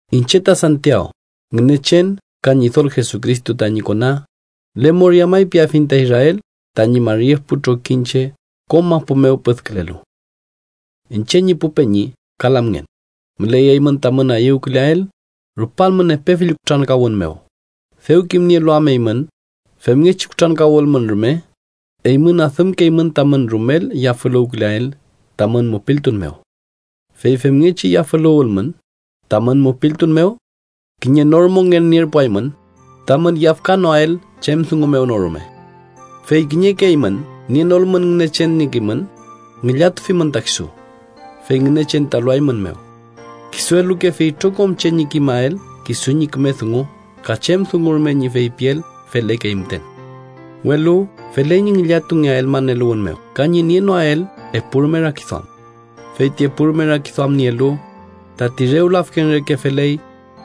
Iñche ta Santiaw, Ngünechen ka Ñidol Jesucristo tañi kona, lemoria may piafiñ ta Israel tañi mari epu trokiñche kom mapu mew püdkülelu. Iñche ñi pu peñi ka lamngen, müley eymün tamün ayüwküleael, rupalmün epe fill kutrankawün mew, dew kimnielu am eymün femngechi kutrankawülmün rume, eymün adümkeymün tamün rumel yafüluwküleael tamün mupiltun mew. Fey femngechi yafüluwülmün tamün mupiltun mew, kiñe nor mongen nierpuaymün, tamün yafkanoael chem dungu mew no rume. Fey kiñeke eymün nienolmün Ngünechen ñi kimün, ngillatufimün ta kisu, fey Ngünechen ta eluaeymünmew. Kisu elukefi itrokom che ñi kimael kisu ñi küme dungu ka chem dungu rume ñi feypiel felekey müten. Welu feley ñi ngillatungeael maneluwün mew ka ñi nienoael epurume rakiduam. Fey ti epurume rakiduam nielu, tati rew lafken reke feley,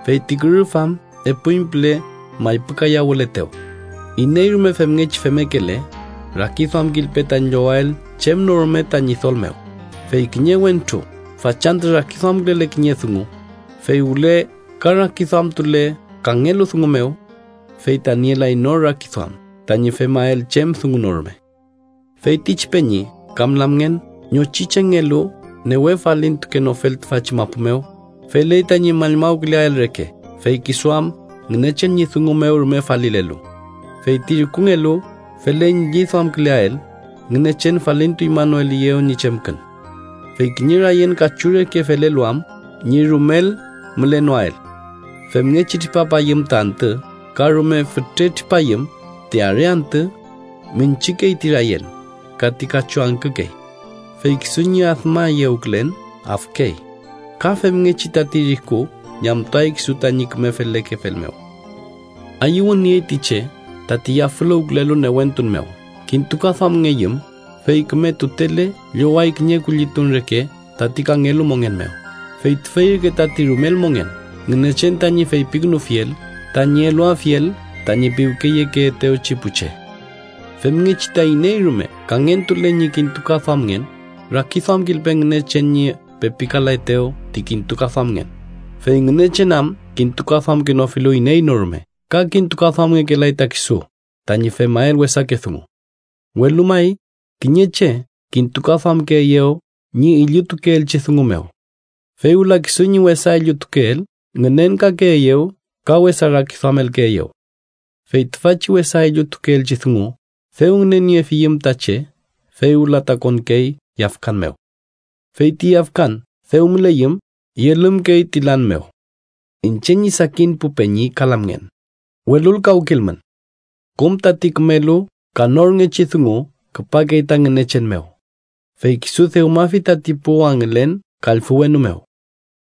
feyti kürüf am epuñpüle maypükayawületew. Iney rume femngechi femmekele, rakiduamkilpe tañi llowael chem no rume ta Ñidol mew, fey kiñe wentru fachantü rakiduamkülele kiñe dungu, fey wüle ka rakiduamtule kangelu dungu mew, fey ta nielay nor rakiduam tañi femael chem dungu no rume. Feytichi peñi kam lamngen ñochi chengelu newe falintukenofel tüfachi mapu mew, feley tañi mallmawküleael reke fey kisu am Ngünechen ñi dungu mew rume falilelu. Feyti rikungelu feley ñi lliduamküleael Ngünechen falintuñmanoeliyew ñi chemkün. Fey kiñe rayen kachu reke felelu am ñi rumel mülenoael. Femngechi tripapayüm ta antü ka rume fütre tripayüm ti are antü, münchükey ti rayen, ka ti kachu angkükey, fey kisu ñi admayewkülen afkey. Ka femngechi, tati riku ñamtuay kisu tañi küme felekefel mew. Ayüwün niey ti che tati yafüluwkelu newentun mew kintukaduamngeyüm, fey küme tutele lloway kiñe kullitun reke tati kangelu mongen mew, fey tüfey ürke tati rumel mongen Ngünechen tañi feypikünufiel tañi eluafiel tañi piwkeyekeetewchi pu che. Femngechi ta iney rume kangentule ñi kintukaduamngen, rakiduamkilpe Ngünechen ñi pepikaletew ti kintukaduamngen, fey Ngünechen am kintukaduamkenofilu iney no rume ka kintukaduamngekelay ta kisu tañi femael wesake dungu. Welu may, kiñe che kintukaduamkeeyew ñi illutukeelchi dungu mew, fey wüla kisu ñi wesa illutukeel ngünenkakeeyew ka wesa rakiduamelkeeyew. Fey tüfachi wesa illutukeelchi dungu, dew ngüneniefiyüm ta che, fey wüla ta konkey yafkan mew. Fey ti yafkan dew müleyüm, yelümkey ti lan mew. Iñche ñi sakin pu peñi ka lamngen, welulkawkilmün. Kom tati kümelu ka norngechi dungu küpakey ta Ngünechen mew, fey kisu dewmafi tati pu wangülen kallfü wenu mew.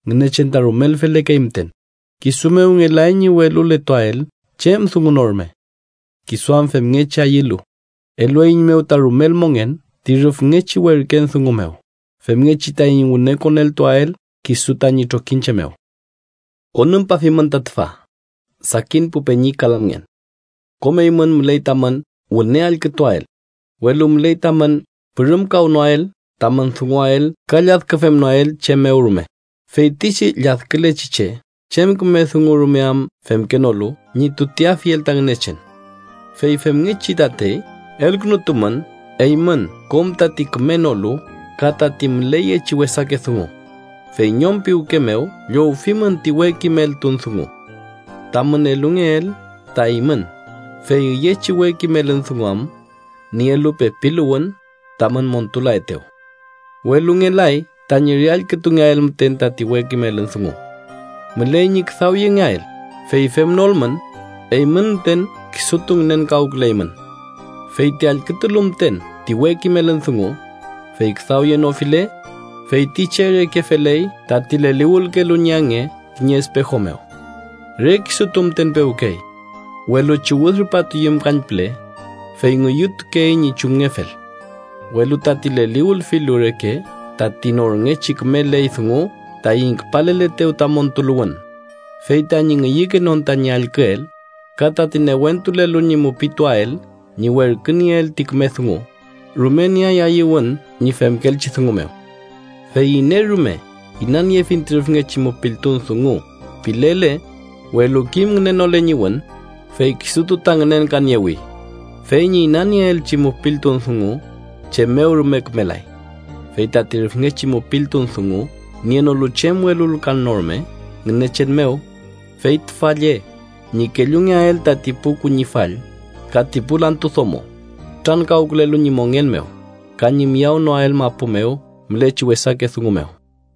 Ngünechen ta rumel felekey müten, kisu mew ngelay ñi weluletuael chem dungu no rume. Kisu am femngechi ayülu, elueiñmew ta rumel mongen ti rüfngechi werken dungu mew, femngechi taiñ wüne koneltuael kisu tañi trokiñche mew. Konümpafimün ta tüfa, sakin pu peñi ka lamngen: kom eymün, müley tamün wüne allkütuael, welu müley tamün pürümkawnoael tamün dunguael ka lladküfemnoael chem mew rume. Feytichi lladkülechi che chem küme dungu rume am femkenolu ñi tuteafiel ta Ngünechen. Fey femngechi tatey, elkünutumün eymün kom tati kümenolu ka tati müleyechi wesake dungu, fey ñom piwke mew llowfimün ti we kimeltun dungu tamün elungeel ta eymün, fey üyechi we kimelün dungu am nielu pepiluwün tamün montulaetew. Welu ngelay tañi re allkütungeael müten tati we kimelün dungu. Müley ñi küdawyengeael, fey femnolmün, eymün müten kisutu ngünenkawküleymün. Feyti allkütulu müten ti we kimelün dungu, fey küdawyenofile, fey ti che reke feley tati leliwülkelu ñi ange kiñe espejo mew. Re kisutu müten pewkey, welu chiwüd rupatuyüm kañpüle, fey ngüyütukey ñi chumngefel. Welu tati leliwülfilu reke tati norngechi küme ley dungu taiñ küpaleletew ta montuluwün, fey tañi ngüyükenon tañi allküel, ka tati newentulelu ñi mupituael ñi werkünieel ti küme dungu, rume nieay ayüwün ñi femkeelchi dungu mew. Fey iney rume “inaniefiñ ti rüfngechi mupiltun dungu” pilele, welu kim ngünenole ñi wün, fey kisutu ta ngünenkaniewi fey ñi inanieelchi mupiltun dungu chem mew rume kümelay. Fey tati rüfngechi mupiltun dungu nienolu chem welulkan no rume Ngünechen mew, fey tüfa lle: ñi kellungeael tati pu kuñifall ka ti pu lantu domo kutrankawkülelu ñi mongen mew, ka ñi miyawnoael mapu mew mülechi wesake dungu mew.